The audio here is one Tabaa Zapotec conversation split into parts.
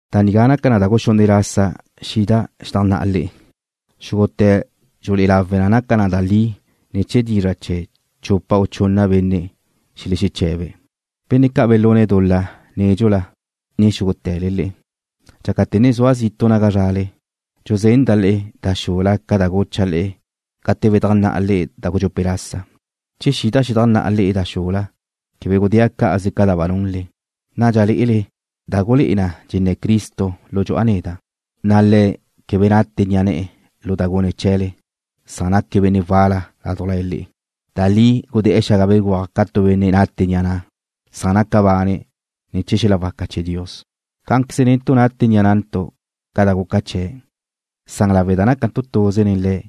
Da nigá naca na da guxunne' lasa xida' xedajnná'a le'e. Xúgute̱ dxulé'e lawe na naca na da li ne̱ chee̱ dizra' chee̱ chupa u chunna benne' xelexeche̱be̱'. Benne' ca' belune̱' dul-la nédxula, ne xúgute̱le le'e, dxácate̱ ne zua' zitu' naga zrale, dxuzenda' le'e da xula ca da gucha' le'e gate bedajnná'a le'e da gudxupe' lasa, che xida' xedajnná'a le'e da xula quebe gudéa' cá'aze ca da ba nunle. Nadxa lé'ele da gulé'e na dxenné̱ Cristo lu dxu'a neda', na' Le̱' quebe nate ni'a ne̱'e̱ lu da gune̱' chee̱le, san naque̱' benne' wal-la ládujla le'e. Da li gudé̱'e̱ xaga béguaj ca tu benne' nate ni'a ne̱'e̱, san naca bane̱' ne̱ chee̱ xel-la waca chee̱ Dios. Cá'anqueze netu' nate ni'a nantu' ca da guca chee̱', san lawe' da nácantu' tuze nen Le̱'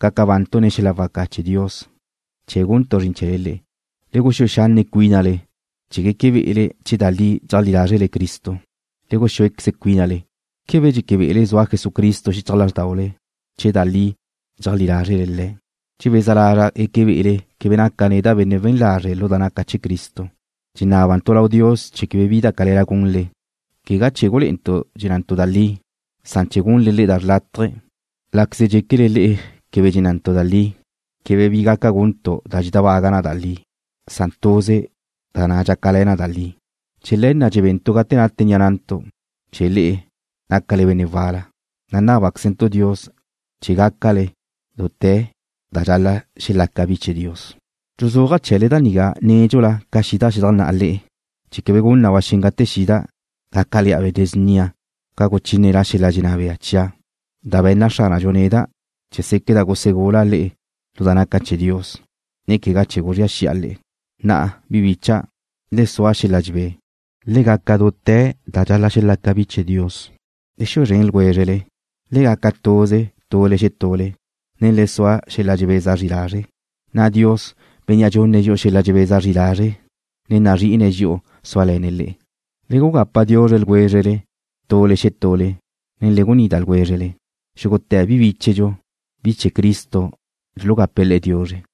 gaca bantu' ne̱ chee̱ xel-la waca chee̱ Dios chee̱ guntu' zrin chee̱le le'e. Le guxúe xanne' cuínale chee̱ gueque be'ele che da li dxeajlí lázrele Cristo. Le guxúequeze cuínale. ¿Quebe dxeque be'ele zua Jesucristo xichaj lázrdaule, che da li dxeajlí lázrele Le̱'? Dxebeza lazra' gueque be'ele quebe naca' neda' benne' we̱n lazre' lu da naca' chee̱ Cristo. Dxenábantu' lau Dios chee̱ quebe bi da cale̱la gunle, quegá chee̱ gulé'entu' dxennantu' da li, san chee̱ gunle le'e da xrlátaje, láqueze dxéquele le'e quebe dxennantu' da li. Quebe bi gaca guntu' da dxedábaga na da li, san tuze da dxácale̱ na da li. Chee̱ le̱ na' dxebentu' gate nate ni'a nantu', che le'e nácale benne' wal-la, na' nábaquezentu' Dios chee̱ gácale dute̱ da dxal-la' xelaca bi chee̱ Dios. Dxuzúaja' chee̱le da nigá nédxula ca xida' xedajnná'a le'e, chee̱ quebe gun na ba xen gate xida', gácale̱'a benne' snia ca guchíneda' xel-la dxenná bea chia', da be̱nna Xránadxu neda' chee̱ séqueda' gusegula' le'e lu da naca chee̱ Dios, ne quegá chee̱ guzría xi'a le'e. Na'a, bi bicha', le sua xel-la dxebé. Le gaca dute̱ da dxal-la' xelaca bi chee̱ Dios. Le xue zren ljwézrele. Le gaca tuze tule xetule, ne le sua xel-la dxebeza zri lazre', na' Dios, Bénnea' dxunne̱' dxi'u xel-la dxebeza zri lazre', ne nazrí'ine̱' dxi'u súale̱ne̱' le'e. Le gugapa diuzre ljwézrele tule xetule, ne le gunida ljwézrele. Xúgute̱ bi bíchedxu, bi chee̱ Cristo dxulugape̱' le'e diuzre.